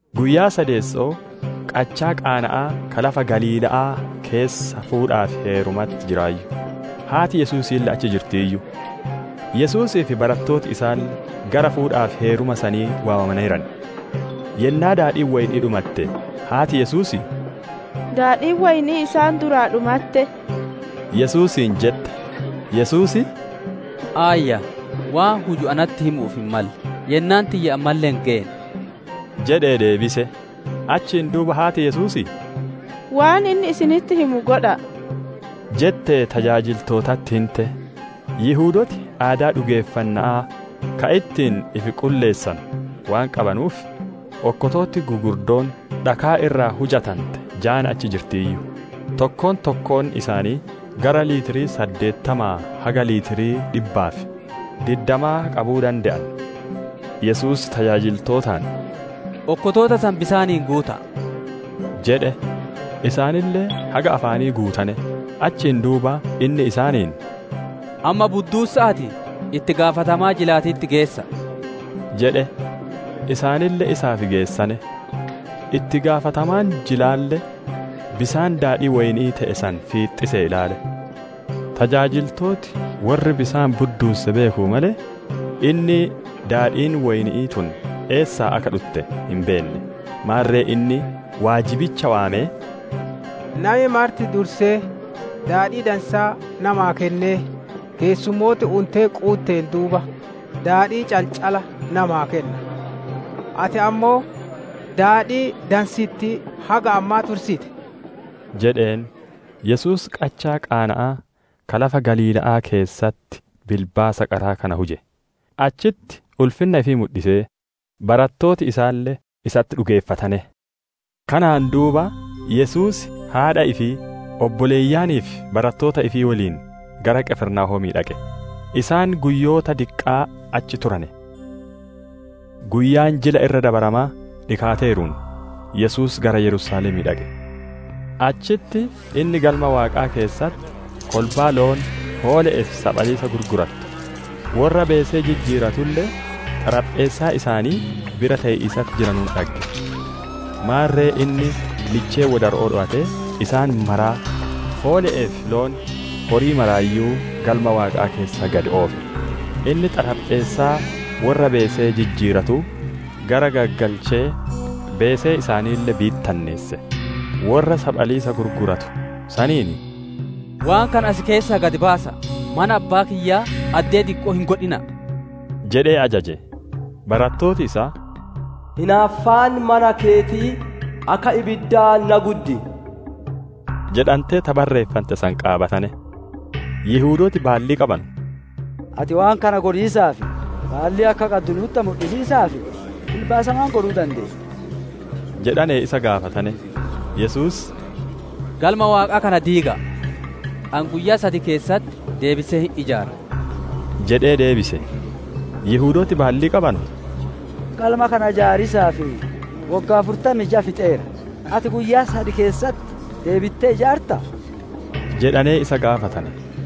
Guyyaa sadeesso'oo qachaa Qaana'aa ka lafa Galiila'aa keessa fuudhaa fi heerumatti jiraayyu. Haati Yesuusiille achi jirtiiyyu. Yesuusii fi barattooti isaalle gara fuudhaa fi heeruma sanii waamamaneeran. Yennaa daadhiin woyni'ii dhumatte, haati Yesuusii, «Daadhii woyni'ii isaan duraa dhumatte» Yesuusiin jette. Yesuus, «Aayyaa, waan huju natti himu'uuf hin malle; yennaan tiyya ammalle hin geenne» jedhee deebise. Achiin duuba haati Yesuusii, «Waan inni isinitti himu godha'a» jettee tajaajiltootatti hinte. Yihudooti aadaa dhugeeffanna'aa ka ittiin ifi qulleessanu waan qabanuuf, okkotooti gugurdoon dhakaa irraa hujante jaan achi jirtiiyyu; tokko tokkoon isaanii gara litirii saddeettamaa haga litirii dhibbaa fi diddamaa qabuu dande'an. Yesuus tajaajiltootaan, «Okkotoota san bisaaniin guuta'a» jedhe. Isaanille haga afaanii guutane. Achiin duuba inni isaaniin, «Amma budduussa'aatii, itti gaafatamaa jilaatitti geessa'a» jedhe. Isaanille isaaf geessane. Itti gaafatamaan jilaalle bisaan daadhii woyni'ii te'e san fiixxisee ilaale. Tajaajiltooti worri bisaan budduusse beekanuu malee, inni daadhiin woyni'ii tun eessaa akka dhutte hin beenne; maarre inni waajibicha waamee, «Nami marti dursee daadhii dansaa namaa kennee, keessummooti untee quutteen duuba daadhii calcala namaa kenna. Ati ammoo daadhii dansittii haga ammaa tursite!» jedheen. Yesuus qachaa Qaana'aa ka lafa Galiila'aa keessatti bilbaasa qaraa kana huje; achitti ulfinna ifii mudhisee, barattooti isaalle isatti dhugeeffatane. Kanaan duuba, Yesuus haadha ifii, obboleeyyanii fi barattoota ifii woliin gara Qifirnaahoomii dhaqe; isaan guyyoota diqqaa achi turane. Guyyaan Jila Irra Dabaramaa dhikaateeruun, Yesuus gara Yerusaalemii dhaqe. Achitti inni Galma Waaqaa keessatti kolbaa loon, hoole'ee fi saphaliisa gurgurattu, worra beesee jijjiiratulle xarapheessaa isaanii bira tee'iisatti jiranuun dhagge. Maarre inni lichee wodaro'oo dhowatee, isaan maraa, hoole'ee fi loon, horii maraayyuu Galma Waaqaa keessaa gad oofe; inni xarapheessaa worra beesee jijjiiratuu garaggaggalchee beesee isaaniille bittinneesse. Worra saphaliisa gurguratu saniin, «Waan kana as keessaa gad baasa'a! Mana Abbaa kiyyaa addee dikko'oo hin godhina'a!» jedhee ajaje. Barattooti isaa, «Hinaaffaan mana keetii, akka ibiddaa na guddi» jedhantee ta barreeffante san qaabatane. Yihudooti baallii qabanu, «Ati waan kana godhiisaaf baallii akka qaddu nu'utti mudhisiisaaf bilbaasa maan godhuu dandeetta?» jedhanee isa gaafatane. Yesuus, «Galma Waaqaa kana diiga'a! Ani guyyaa sad keessatti deebisee hin ijaaraa» jedhee deebise. Yihudooti baallii qabanu, «Galma kana ijaariisaaf woggaa afurtamii jaa fixeera, ati guyyaa sad keessatti deebittee ijaartaa?» jedhanee isa gaafatane.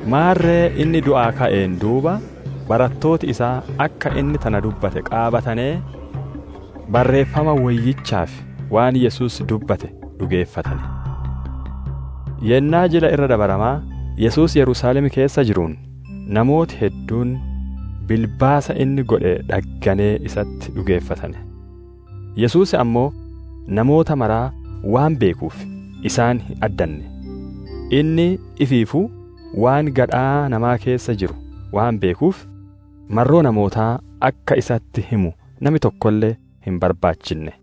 Maarre inni du'aa ka'een duuba, barattooti isaa akka inni tana dubbate qaabatanee, Barreeffama Woyyichaa fi waan Yesuus dubbate dhugeeffatane. Yennaa Jila Irra Dabaramaa Yesuus Yerusaalem keessa jiruun, namooti hedduun bilbaasa inni godhe dhagganee isatti dhugeeffatane. Yesuus ammoo namoota maraa waan beekuuf, isaan hin addanne. Inni ifiifuu waan gadhaa namaa keessa jiru waan beekuuf, marroo namootaa akka isatti himu nami tokkolle hin barbaachinne.